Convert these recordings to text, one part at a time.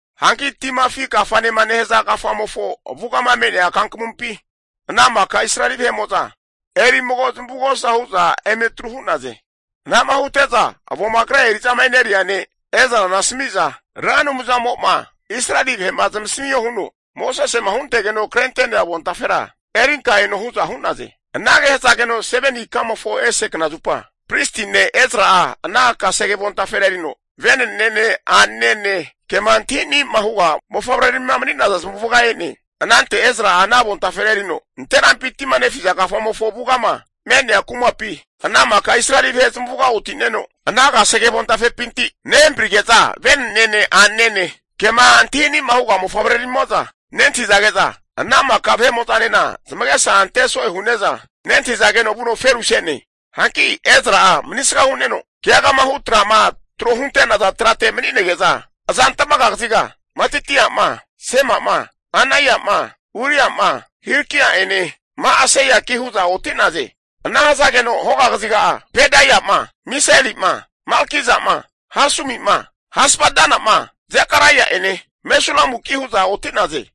Hanki Tima Afi Kafanema nehaza kafamofo avugama me'nea kankamumpi ana maka Israeli vahe'mo'za eri mago zamavugosa hu'za eme atru hu'naze. Anama hute'za avoma kre eri'zama e'neria ne' Ezrana asami'za, Ra Anumzamo'ma Israeli vahe'ma zamasamio huno, Mosesema huntegeno krente'nea avontafera erinka eno hu'za hu'naze. Anage hazageno 7ni ikamofo ese knazupa, pristi ne' Ezra'a ana kasege avontafera erino, venenene a'nene kema antahini'ma huga mofavreramima mani'naza zamavuga e'ne. Anante Ezra'a ana avontafera erino nanterampi tima nefiza kafamofo avugama me'nea kumapi, ana maka Israeli vahe zamavuga oti'neno, ana kasege avontafepinti nehamparige'za vene'nene a'nanene, kema antahi ani'ma huga mofavreramimo'za nentahizage'za, ana maka vahe'mo'zanena zamagesa ante so'e hu'neza nentahizageno vuno feruse'ne. Hanki Ezra'a manisga hu'neno keagama hu tra'ma tro hunte'naza trate mani'nege'za azantmaga kaziga, Matitia'ma, Sema'ma, Anaia'ma, Uria'ma, Hilkia'ene Ma'aseiaki hu'za oti'naze. Ana hazageno hoga kaziga'a Pedaia'ma Misaeli'ma Malkija'ma Hasumi'ma Hasbadana'ma Zekaraia'ene Mesulamuki hu'za oti'naze.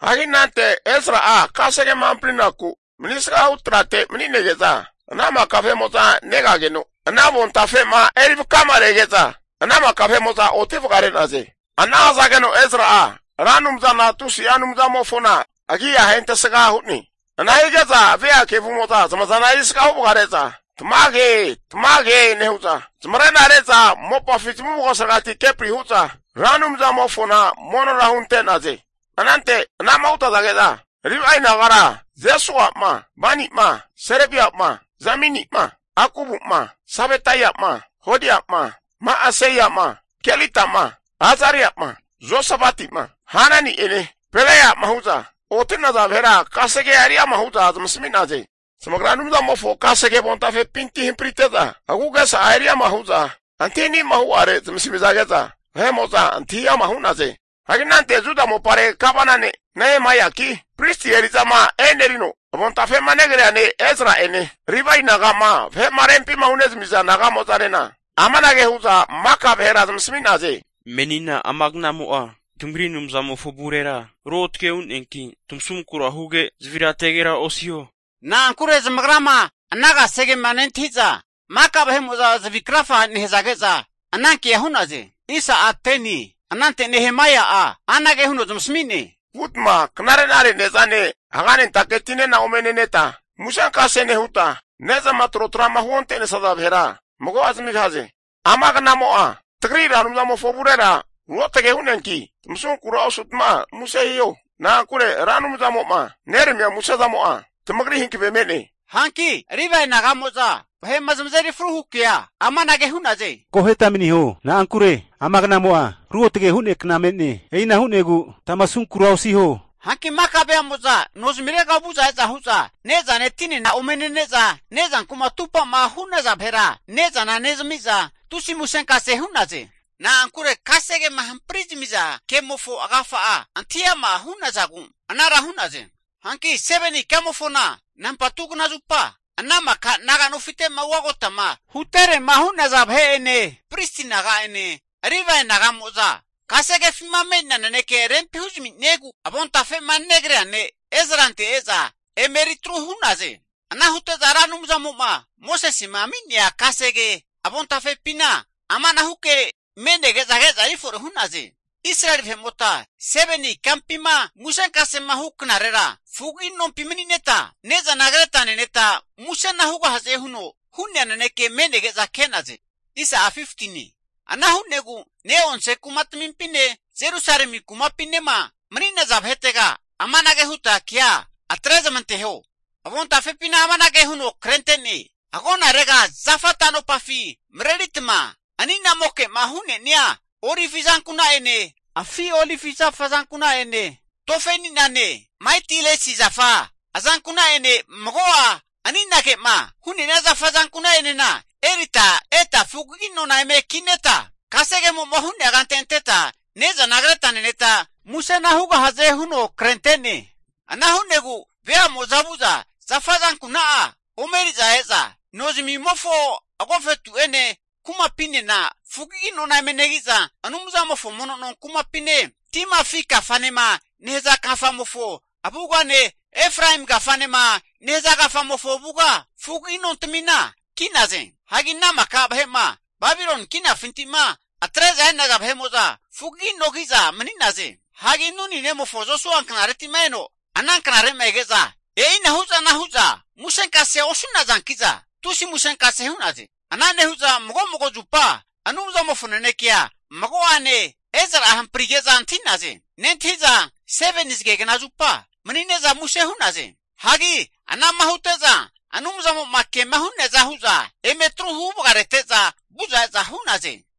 Hagi anante Ezra'a kasegema hamprinaku manisga hu trate mani'nege'za ana maka vahe'mo'za negageno, ana avontafe'ma erivakama rege'za, ana maka vahe'mo'za oti vagare'naze. Ana hazageno Ezra'a Ra Anumzana tusi'a Anumzamofona agi'a ahentesga hu'ne. Ana hige'za ve'a kevumo'za zamazana erisga huvagare'za, Tamage, Tamage nehu'za, zamarena re'za mopafi zamavugosaregati kepri hu'za Ra Anumzamofona monora hunte'naze. Anante anama hutazage'za, Livae nagara Jesua'ma Bani'ma Serebia'ma Jamini'ma Akubu'ma Sabetaia'ma Hodia'ma Ma'aseia'ma Kelita'ma Azaria'ma Josabati'ma Hanani'ene Pelaia'ma hu'za, oti'naza vahera kasegea eriama hu'za zamasami'naze. Zamagra Anumzamofo kasege avontafepinti hamparite'za, agu'gesa'a eriama hu'za vahe'mo'zama antahi ani'ma hu'are zamasamizage'za antahi ama' hu'naze. Hagi anante Juda mopare gavana ne' Nehemaiaki, Pristi eri'zama enerino avontafe'ma negrea ne' Ezra'ene Livae naga'ma vahe'ma rempima hunezamiza naga'mo'zanena amanage hu'za maka vahera zamasami'naze, Menina amagnamo'a tamagri Anumzamofo avurera ruotge hu'neanki tamasunkura huge, zavirategera osiho. Na'ankure zamagrama ana kasegema nentahi'za maka vahe'mo'za zavi krafage nehazage'za anankea hu'naze. Anante Nehemaia'a anage huno zamasami'ne, Vutma knare'nare ne'zane haganentake tinena ome neneta, musenkase nehuta ne'zama trotra'ma huonte'nesaza vahera mago'a zamigahaze. Amagnamo'a tagri Ra Anumzamofo avurera ruotage hu'neanki, tamasunkura osutma muse hiho. Na'ankure Ra Anumzamo'ma neramia musezamo'a tamagri hankave me'ne. Hanki Livae naga'mo'za vahe'ma zamazeri fru hu kea amanage hu'naze, Akoheta maniho, na'ankure amagnamo'a ruotge hu'nea kna me'ne. E'ina hu'negu tamasunkura osiho. Hanki maka veamo'za no zamirega vu'za e'za hu'za, ne'zane tinena ome nene'za, ne'zankuma atupa'ma hu'naza vahera ne'zana nezami'za tusi musenkase hu'naze. Na'ankure kasegema hampari zamiza kemofo agafa'a antahi ama hu'nazagu anara hu'naze. Hanki 7ni ikamofona nampa2 knazupa, ana maka naga nofite'ma ugagotama huterema hu'naza vahe'ene pristi vahe'mo'zane Livae naga'moza, kasegefima me'nea naneke rempi huzami'niegu avontafe'ma negrea ne' Ezrante e'za emeritru hu'naze. Ana hute'za Ra Anumzamo'ma Mosesema ami'nea Kasege avontafepina amanahu ke me'nege'za ke'za erifore hu'naze. Israeli vahe'mota 7ni ikampima musenkasema hu knarera fugagi nompi mani'neta ne'zana kreta neneta musena hugahaze huno hu'nea naneke me'nege'za ke'naze. Ana hu'negu ne'onse kumatmimpine Jerusalemi kumapinema mani'naza vahetega amanage huta kea atre zamanteho, avontafepina amanage huno krente'ne, agonarega zafa tanopafi mareritma ani'namoke'ma hu'nenia olivi azankuna'ene, afi olivi zafa azankuna'ene tofe ani'nane Maitilesi zafa (myrtle) azankuna'ene mago'a ani'nage'ma hu'nea zafa azankuna'enena erita eta fugagi nona eme kineta kasegemo'ma hu'nea kante anteta ne'zana kreta neneta, musena hugahaze huno krentene. Ana hu'negu veamo'za vu'za zafa azankuna'a ome eri'za e'za nozamimofo agofetu'ene kumapinena fugagi nona eme negi'za, Anumzamofo mono no kumapine, Tima afi Kafanema nehaza kafamofo avugane, Efraemi kafanema nehaza kafamofo avuga fugagi nontamina ki'naze. Hanki ana maka vahe'ma Babiloni kinafinti'ma atre'za e'naza fugagi no ki'za mani'naze. Hagi Nuni nemofo Josua knareti'ma eno ana knare'ma ege'za, e'inahu zana hu'za musenkasea osu'nazanki'za, tusi musenkase hu'naze. Ana nehu'za mago mago zupa Anumzamofo nanekea mago'ane Ezra'a hamprige'za antahi'naze. Nentahi'za seveni zagekna zupa mani'ne'za muse hu'naze. Hagi ana'ma hute'za Anumzamo'ma kema hu'nea za hu'za eme atru huvagarete'za vu'za e'za hu'naze.